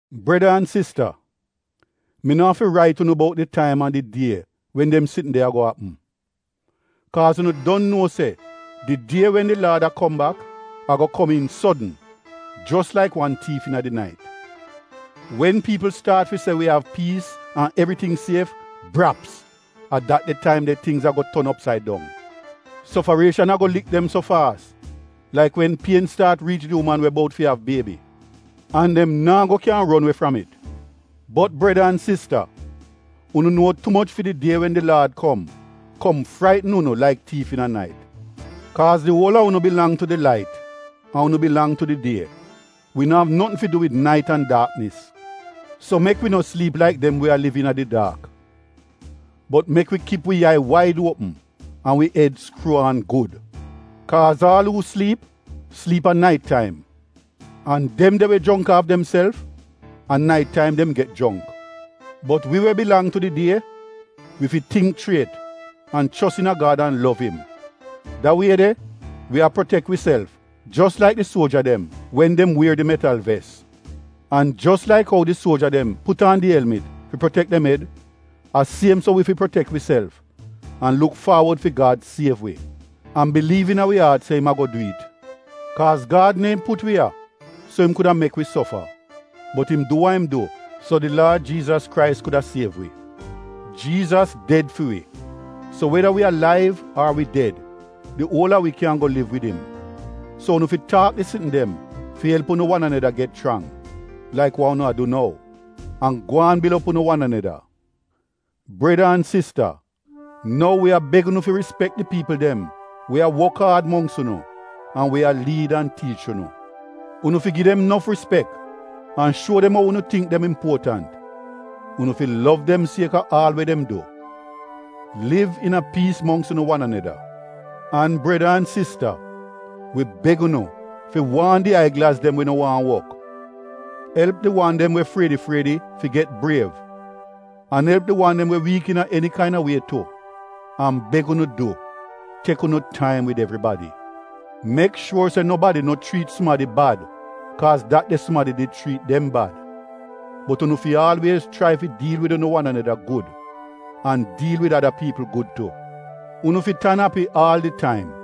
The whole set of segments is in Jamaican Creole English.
Breda an sista, mi no afi rait unu bout di taim an di die wen dem sitn de ago apm. Kaaz unu don nuo se di die wen di Laad a kom bak ago kom iin sodn, jos laik wan tiif iina di nait. Wen piipl staat fi se wi av piis an evriting sief, braps — a dat de taim tingz ago ton opsaid dong. Sofarieshan ago lik dem so faas laik wen pien staat riich di uman we bout fi av biebi. An dem naa go kyan ron we fram it. Bot, breda an sista, unu nuo tu moch, fi di die wen di Laad kom, kom fraitn unu laik tiif iina nait. Kaaz di uol a unu bilang tu di lait an unu bilang tu di die. Wi no av notn fi du wid nait an daaknis. So mek wi no sliip laik dem we a liv iina di daak. Bot mek wi kip wi yai waid uopm an wi ed skruu aan gud. Kaaz aal uu sliip — sliip a nait taim. An dem de we jongk aaf demself — a nait taim dem get jongk. Bot wi we bilang tu di die, wi fi tingk chriet an chos iina Gad an lov im. Da wie de wi a protek wiself jos laik di suoja dem wen dem wier di metal ves. An jos laik ou di suoja dem put aan di elmit fi protek dem ed, a siem so wi fi protek wiself an luk faawod fi Gad siev wi, an biliiv iina wi aat se im ago du it. Kaaz Gad neehn put wi ya, so im kuda mek wi sofa, bot im du wa im du so di Laad Jiizas Krais kuda siev wi. Jiizas ded fi wi, so weda wi alaiv ar wi ded di uol a wi kyan go liv wid im. So unu fi taak di sitn dem fi elp unu wan aneda get chrang, laik wa unu a du nou, an gwaan bil op unu wan aneda. Breda an sista, nou wi a beg unu fi rispek di piipl dem we a wok aad mongks unu, an we a liid an tiich unu. Unu fi gi dem nof rispek an shuo dem ou unu tingk dem impuotant. Unu fi lov dem sieka aal we dem du. Liv iina piis mongks unu wan aneda. An breda an sista, wi beg unu fi waan di aiglaz dem we no waahn wok; elp di wan dem we friedi-friedi fi get briev, an elp di wan dem we wiik iina eni kaina wie tu. An beg unu du, tek unu taim wid evribadi. Mek shuor se nobadi no chriit sumadi bad kaaz dat de sumadi did chriit dem bad, bot unu fi aalwiez chrai fi diil wid unu wan aneda gud, an diil wid ada piipl gud tu. Unu fi tan api aal di taim.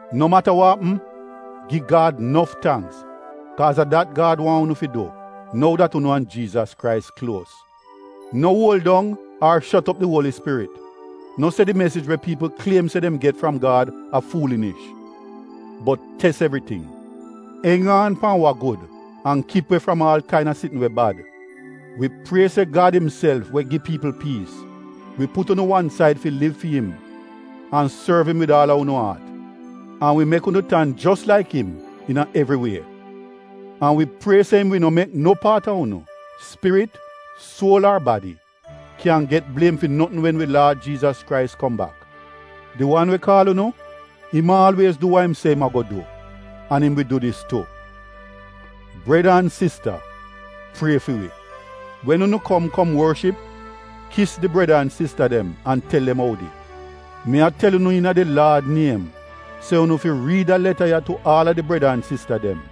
No mata wa apm gi Gad nof tangks kaaz a dat Gad waahn unu fi du nou dat unu an Jiizas Krais kluos. No uol dong ar shot op di Uoli Spirit. No se di mesij we piipl kliem se dem get fram Gad a fuulinish, bot tes evriting. Eng aan pan wa gud, an kip we fram aal kaina sitn we bad. Wi prie se Gad imself we gi piipl piis, wi put unu wan said fi liv fi im an sorv im wid aal a unu aat, an wi mek unu tan jos laik im iina evri wie. An wi prie se im wi no mek no paat a unu — spirit, suol ar badi, kyan get bliem fi notn wen wi Laad Jiizas Krais kom bak. Di wan we kaal unu, im aalwiez du wa im se im ago du, an im wi du dis tu. Breda an sista, prie fi wi. Wen unu kom kom worship, kis di breda an sista dem an tel dem oudi. Mi a tel unu iina di Laad niem se unu fi riid da leta ya tu aal a di breda an sista dem.